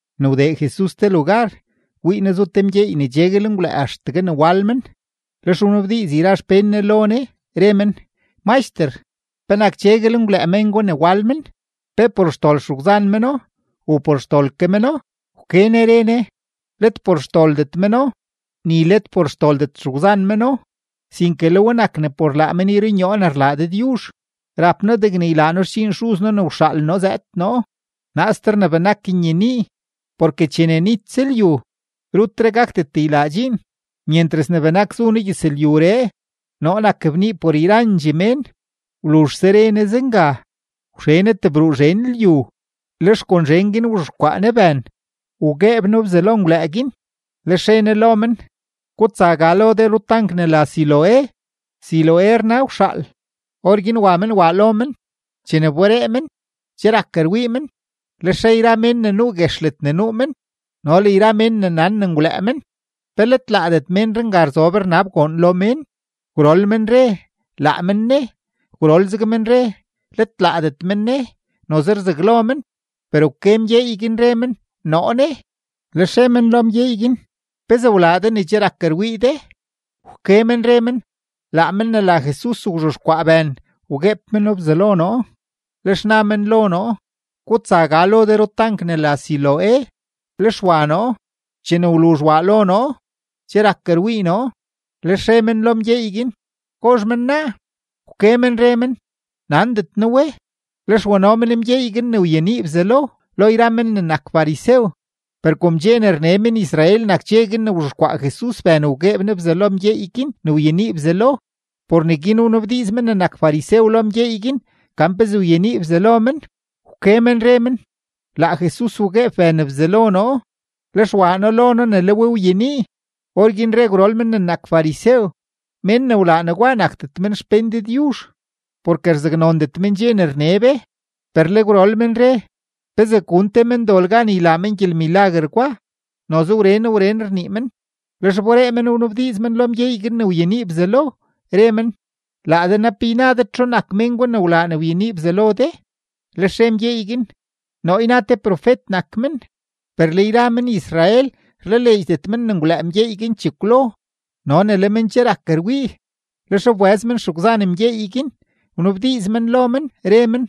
Ne wdee Jesus te lugar, wii Ne zu te mgyeey ne cheguel ngwlëë axtegue ne wal men. Lex wnabdiiz yra xpén Ne lo Ne, re men: ―Maxter, ¿penak cheguel ngwlëë mén gwa ne wal men? ¿Pe por xdol xegwzan meno u por xdol ke meno? Wke Ne re Ne: ―Let por xdoldet meno, ni let por xdoldet xegwzan meno, sinke le we nak ne por laa men yrunyoo ne rlaa Dëdyuzh. Rap noo degne ylaa noo xdxiin Xuz noo ne wxaal noo zëëd noo, naaster ne benak nyenii, porke chene nitse lyu, rutre gakdet ylaa dxiin. Myentras ne benak zu noo gyëzlyuree, noo nak bnii por yrandxee mén. Wluzhse re Ne zenga, wxe Ne tebruu zhen lyu, lex kon zhen guin wzhexkwaa Ne bën, wgueeb No bzalo menngwlëë guin. Lex re Ne lo men: ―Gutsa ga lo de rutank ne la Siloé. (Siloé rna Wxaal.) Orguin wa men waa lo men. Chene wberee men, che rak rwii men. Lex re yra mén ne nuu guex ledne nuu men no le yra mén ne nan ne ngwlëë men: ―¿Pe let laadet ménree nga rzob rnab goon lo mén? Gwrol men re: ―Laa men ne. Gwrol zeg men re: ―Let laadet men ne, noze rzaglo men. Per wke mgyeey guin, re men: ―Noo ne. Lex re men lo mgyeey guin: ―¿Pezee wlaa de ne che rak rwii de? Wke men re men: ―Laa men ne la Jesus wzhexkwaa bën, wgueeb meno bzalo noo, lex na men lo noo: “Gutsa ga lo de rutank ne la Siloé.” Lex wa noo. Chene wluzh waa noo lo noo, che rak rwii noo. Lex re men lo mgyeey guin: ―¿Gozh men naa? Wke men re men: ―Nandet noo we. Lex wano men mgyeey guin ne wyenii bzalo, lo yra men ne nak farisew. Per kom dxe ne rne men-Israel nak dxe guin ne wzhexkwaa Jesus bën ne wgueeb Ne bzalo mgyeey guin ne wyenii bzalo, por neguin wnabdiiz men ne nak farisew lo mgyeey guin gan pezee wyenii bzalo men. Wke men re men: ―Laa Jesus wgueeb bën bzalo noo; lex waa noo lo noo ne le we wyenii. Orguin re gwrol men ne nak farisew: ―Mén ne wlaa negwa nakdet men xpén Dëdyuzh, porke rzaknondet men dxe ne rne be. Per le gwrol men re: ―¿Pezee gun te mendol gan ylaa men gyelmilaguer gwa? Noze wren wren rnii men. Lex wberee men wnabdiiz men lo mgyeey guin ne wyenii bzalo, re men: ―¿Laa de naa, pe yna de txu nak mén gwa ne wlaa ne wyenii bzalo de? Lex re mgyeey guin: ―Noo yna te profet nak men. Per le yra men-Israel rlaleedxdet men ne ngwlëë mgyeey guin chekwlo no ne le men che rak rwii; lex wbëz men xegwzan mgyeey guin, wnabdiiz men lo men, re men: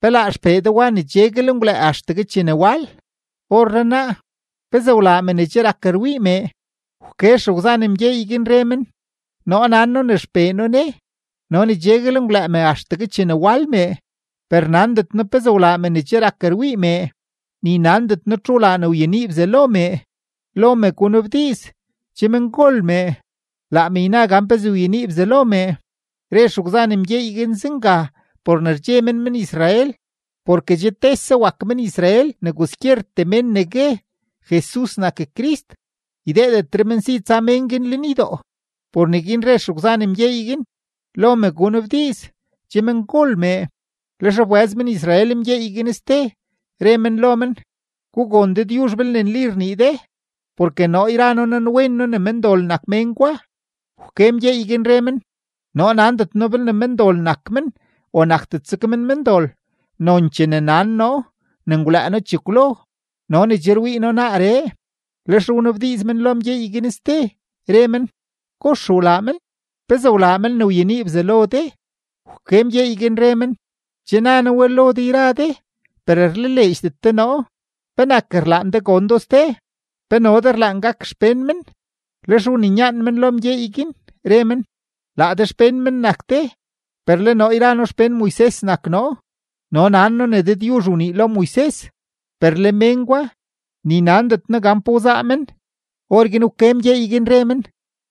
―¿Pe laa xpee de wa ne cheguel ngwlëë axtegue chene wal? Orrenaa, ¿pezee wlaa me ne che rak rwii mee? Wke xegwzan mgyeey guin, re men: ―Noo nan noo ne xpee noo ne no ne cheguel ngwlëë me axtegue chene wal mee; per nandet noo pezee wlaa me ne che rak rwii mee, ni nandet noo txu wlaa ne wyenii bzalo mee. Lo me gunabdiiz, che mengol mee; laa me yna gan pezee wyenii bzalo mee. Re xegwzan mgyeey guin zenga por ne rdxe men men-Israel, porke che tese wak men-Israel ne kwaskyertee mén ne gue: “Jesus nak Crist”, ydeedetre men si tsa mén guin lenydoo. Por neguin re xegwzan mgyeey guin: “Lo me gunabdiiz, che mengol mee.” Lex wbëz men-Israel mgyeey guin ste, re men lo men: ―Gugon Dëdyuzh, belne nli rnii de, porke noo yra noo nanwen noo ne mendol nak mén gwa. Wke mgyeey guin, re men: ―Noo nandet noo belne mendol nak men o nakdet zeg men mendol. Nonchee ne nan noo ne ngwlëë noo chekwlo no ne che rwii noo naaree. Lex wnabdiiz men lo mgyeey guin ste, re men: ―¿Kox wlaa men? ¿Pezee wlaa men ne wyenii bzalo de? Wke mgyeey guin, re men: ―Che na noo we lo de yra de, per rlaleedxdet de noo. ¿Penak rlaan de gon do ste? ¿Pe no de rlaan gak xpén men? Lex wninyaan men lo mgyeey guin, re men: ―Laa de xpén men nak de, per le noo yra noo xpén Moises nak noo. No nan noo ne Dëdyuzh wnii lo Moises. Per le mén gwa, ni nandet noo gan pa wzaa men. Orguin wke mgyeey guin, re men: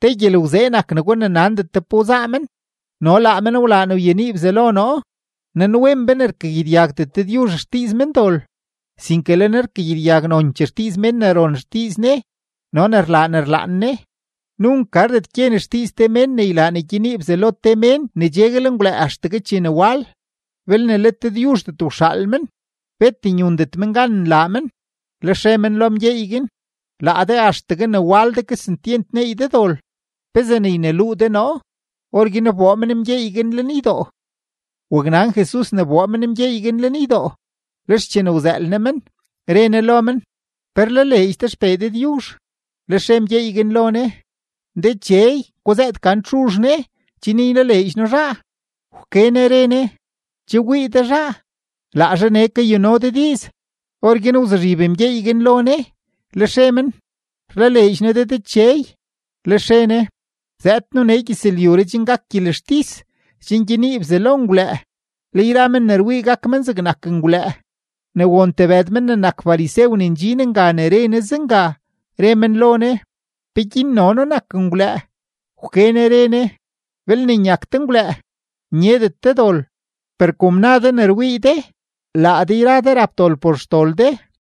―Te gyelgwzee nak negwa ne nandet de gan pa wzaa men, no laa men wlaa ne wyenii bzalo noo. Nanwen be ne rkagyedyagdet Dëdyuzh xdiiz mendol, sinke le Ne rkagyedyag nonchee xdiiz mén ne ron xdiiz Ne no ne rlaa ne rlaan Ne. Nunk gardet gyen xdiiz te mén ne ylaa ne gyenii bzalo te mén ne cheguel ngwlëë axtegue chene wal. Belne let Dëdyuzhdet wxaal men, bet nyundet men gan nlaa men. Lex re men lo mgyeey guin: ―Laa de axtegue ne wal de, kesentyent neey de dol; ¿pezee ne yneluu de noo? Orguin wboo men mgyeey guin lenydoo. Waknan Jesus ne wboo men mgyeey guin lenydoo, lex chene wzëël Ne men, re Ne lo men: ―¿Pe rlaleedx de XPee Dëdyuzh? Lex re mgyeey guin lo Ne: ―Dechey, guzëët gan txuzh ne, chen ylaleedx noo zhaa. Wke Ne re Ne: ―Che wii de zhaa. Laa zhaa nee kayuno de diiz. Orguin wzuzhib mgyeey guin lo Ne, lex re men: ―Rlaleedx noo de, Dechey. Lex re Ne: ―Zëëd noo nee gyëzlyuree chen gak gyelextis, chen gyenii bzalo menngwlëë, le yra men ne rwii gak men zegnak menngwlëë. Ne won tebëd men ne nak farisew ne ndxin nga ne re Ne zenga, re men lo Ne: ―¿Peguin no noo nak ngwlëë? Wke Ne re Ne: ―Belne nyak de ngwlëë, nyeeydet de dol. Per kom na de ne rwii de, laa de yra de rap dol por xdol de.